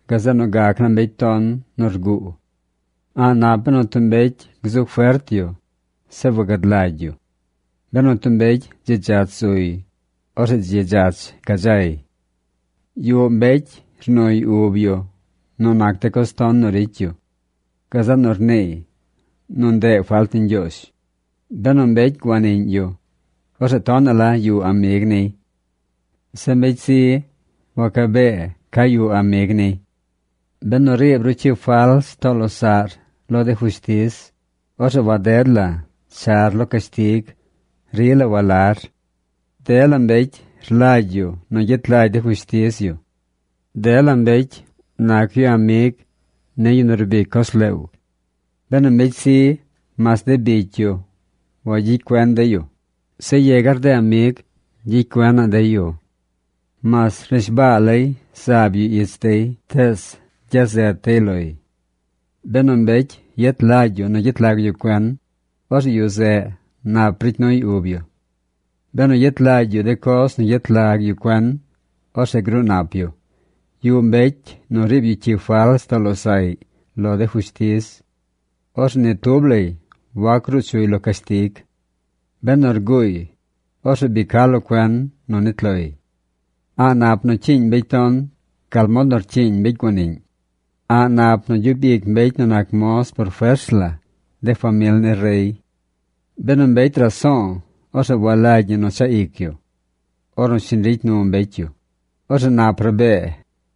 gazeꞌ nu gac naa mbecy ton nu rguu. A̱ꞌ nap benu tub mbecy gzu fert yu, zeꞌ wagad lagy yu. Benu tub mbecy dzi dzach zuy, orzeꞌ dzi dzach gadzay. Yuꞌ mbecy rnuy ub yu nu nac de coz ton nu ricy yu. Gazeꞌ nu rniiy nu ndeꞌ falt ni Ñgyoozh. Benu mbecy guaniꞌñ yu, orzeꞌ tonaꞌ la yuꞌ amig niy. Zeꞌ mbecy zi wacabee ca yuꞌ amig niy. Benu riib ru cyi fals too losaꞌr lo de fushtiz, orzeꞌ waded la char lo cashtig. Rila walar. Dela mbecy rlagy yu nu gyet lagy de fushtiz yu. Dela mbecy nac yu amig ni yu nu rbic coz leew. Benu mbecy zi, mas de bicy yu wagyicy cuen dey yu. Zeꞌ yegar de amig gyicy cuenaꞌ dey yu. Mas rnishbaa lay zaab yu ich dey, tees gyazet dey loy. Benu mbecy yet lagy yu nu gyet lag yu cuen, orzeꞌ yu zeꞌ nap ricy nuy ub yu. Benu yet lagy yu de coz nu yet lag yu cuen, orzeꞌ gruu nap yu. Yuꞌ mbecy nu riib yu cyi fals too losaꞌy lo de fushtiz. Orzeꞌ ni tub lay wac gruu chuy lo cashtig. Benu rguuy, orzeꞌ bi ca lo cuen nu nit loy. A̱ꞌ nap nu cyiiñ mbecy ton gal mod nu rcyiiñ mbecy güaniꞌñ. A̱ꞌ nap nu gyub ic mbecy nu nac moz por fers la de famil ni rey. Benu mbecy raso̱o̱, orzeꞌ walagy ñi nu chaꞌ ic yu. Ornu shiñ ricy nu mbecy yu, orzeꞌ nap rabee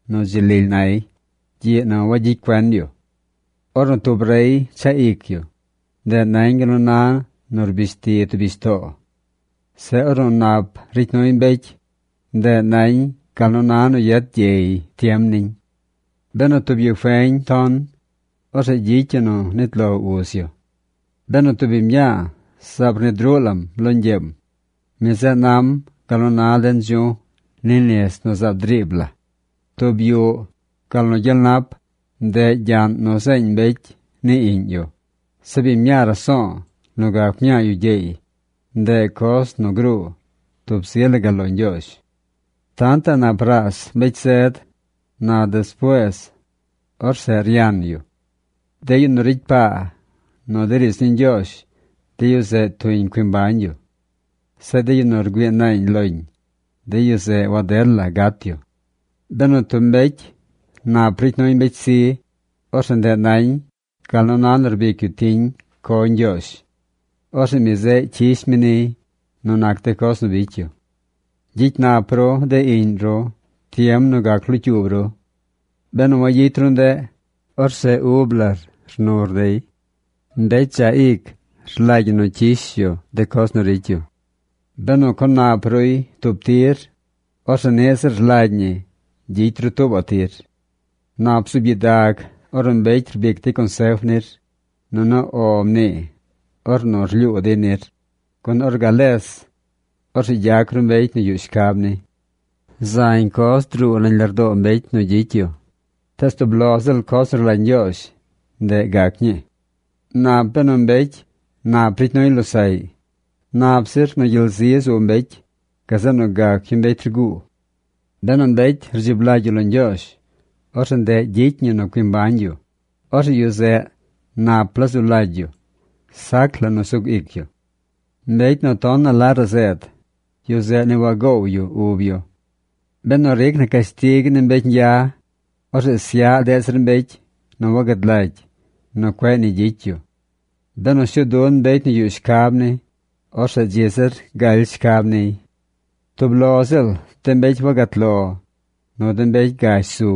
nu dzi lily nay gyiꞌ nu wagyicy cuen yu. Ornu tub rey chaꞌ ic yu, ndeꞌ nañ gal nu na nu rbish ti tub bishtoo. Zeꞌ ornu nap ricy nuy mbecy, ndeꞌ nañ gal nu na nu yet gyey tiem niñ. Benu tub yu feñ ton, orzeꞌ gyicy yu nu nit lo uz yu. Benu tub biñ mñaa zaab rnid ruꞌ lam lo ñgyeem, mi zeꞌ nam gal nu na de ndzu̱j ni nis nu zaab driib la. Tub yuꞌ, gal nu gyel nap, ndeꞌ gyaꞌn nu zeeñ mbecy ni iꞌñ yu. Zeꞌ biñ mñaa raso̱o̱ nu gac mñaa yu gyeey, ndeꞌ coz nu gruu tub zi la gal lo Ñgyoozh. Tantaꞌ nap raas mbecy zed. Na despuees, orzeꞌ ryan yu. De yu nu ricy paa nu de riidz ni Ñgyoozh, de yu zeꞌ tuñ cui mbañ yu. Zeꞌ de yu nu rgüii naañ loñ, de yu zeꞌ waded la gat yu. Benu tub mbecy nap ricy nuy mbecy zi, orzeꞌ ndeꞌ nañ gal nu na nu rbic yu tiñ co Ñgyoozh. Orzeꞌ mi zeꞌ cyish mi niy nu nac de coz nu bicy yu. Gyicy nap ru de iꞌñ ru tiem nu gac locyuub ru. Benu wayicy ru ndeꞌ, orzeꞌ ub lar rnur dey. Mbecy dzaꞌ ic rlagy ñi nu cyish yu de coz nu ricy yu. Benu co nap ruy tub tir, orzeꞌ niꞌ ziꞌl rlagy ñi gyicy ru tuubaꞌ tir. Nap bzuub gyidag ornu mbecy rbic dey consef nir, nunu “O” mnii ornu rlyuu dey nir, gun or gales, orzeꞌ gyac ru mbecy nu yuꞌ shcab ni. Zañ coz druu nañ lardoo mbecy nu gyicy yu, tees tub lo ziꞌl coz nu rlagy Ñgyoozh ndeꞌ gac ñii. Nap benu mbecy nap ricy nuy losaꞌy. Nap zir nu gyel zi zu mbecy gazeꞌ nu gac yu mbecy rguu. Benu mbecy rdzib lagy yu lo Ñgyoozh, orzeꞌ ndeꞌ gyicy ñi nu cui mbañ yu. Orzeꞌ yu zeꞌ nap la zu lagy yu. Sac la nu sug ic yu. Mbecy nu tonaꞌ la razeed, yu zeꞌ ni wagoow yu ub yu. Benu ric na cashtig ni mbecy ñgya, orzeꞌ syaꞌ deꞌ zir mbecy nu wagad lagy nu cueꞌ nu ni gyicy yu. Benu shuu dun mbecy nu yuꞌ shcab ni, orzeꞌ dzi zir galy shcab niy. Tub lo ziꞌl de mbecy wagat lo, nu de mbecy gash zu,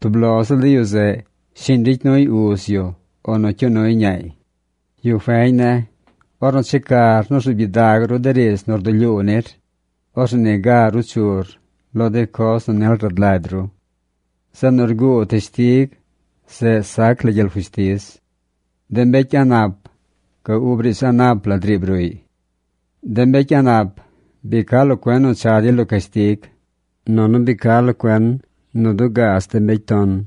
tub lo ziꞌl de yu zeꞌ shiñ ricy nuy uz yu o nu cyuu nuy ñaay. Yu feñ ne̱, ornu checar nu rzuub gyidag ru de riidz nu rdulyuu nir, orzeꞌ niga ruu chur lo de coz nu nil rad lagy ru. Zeꞌ nu rguu teshtig zeꞌ sac la gyel fushtiz. De mbecy a̱ꞌ nap ga ub riidz a̱ꞌ nap la driib ruꞌy. De mbecy a̱ꞌ nap bi ca locuen nu cha dey lo cashtig, nunu bi ca lo cuen nu dugaaz de mbecy ton.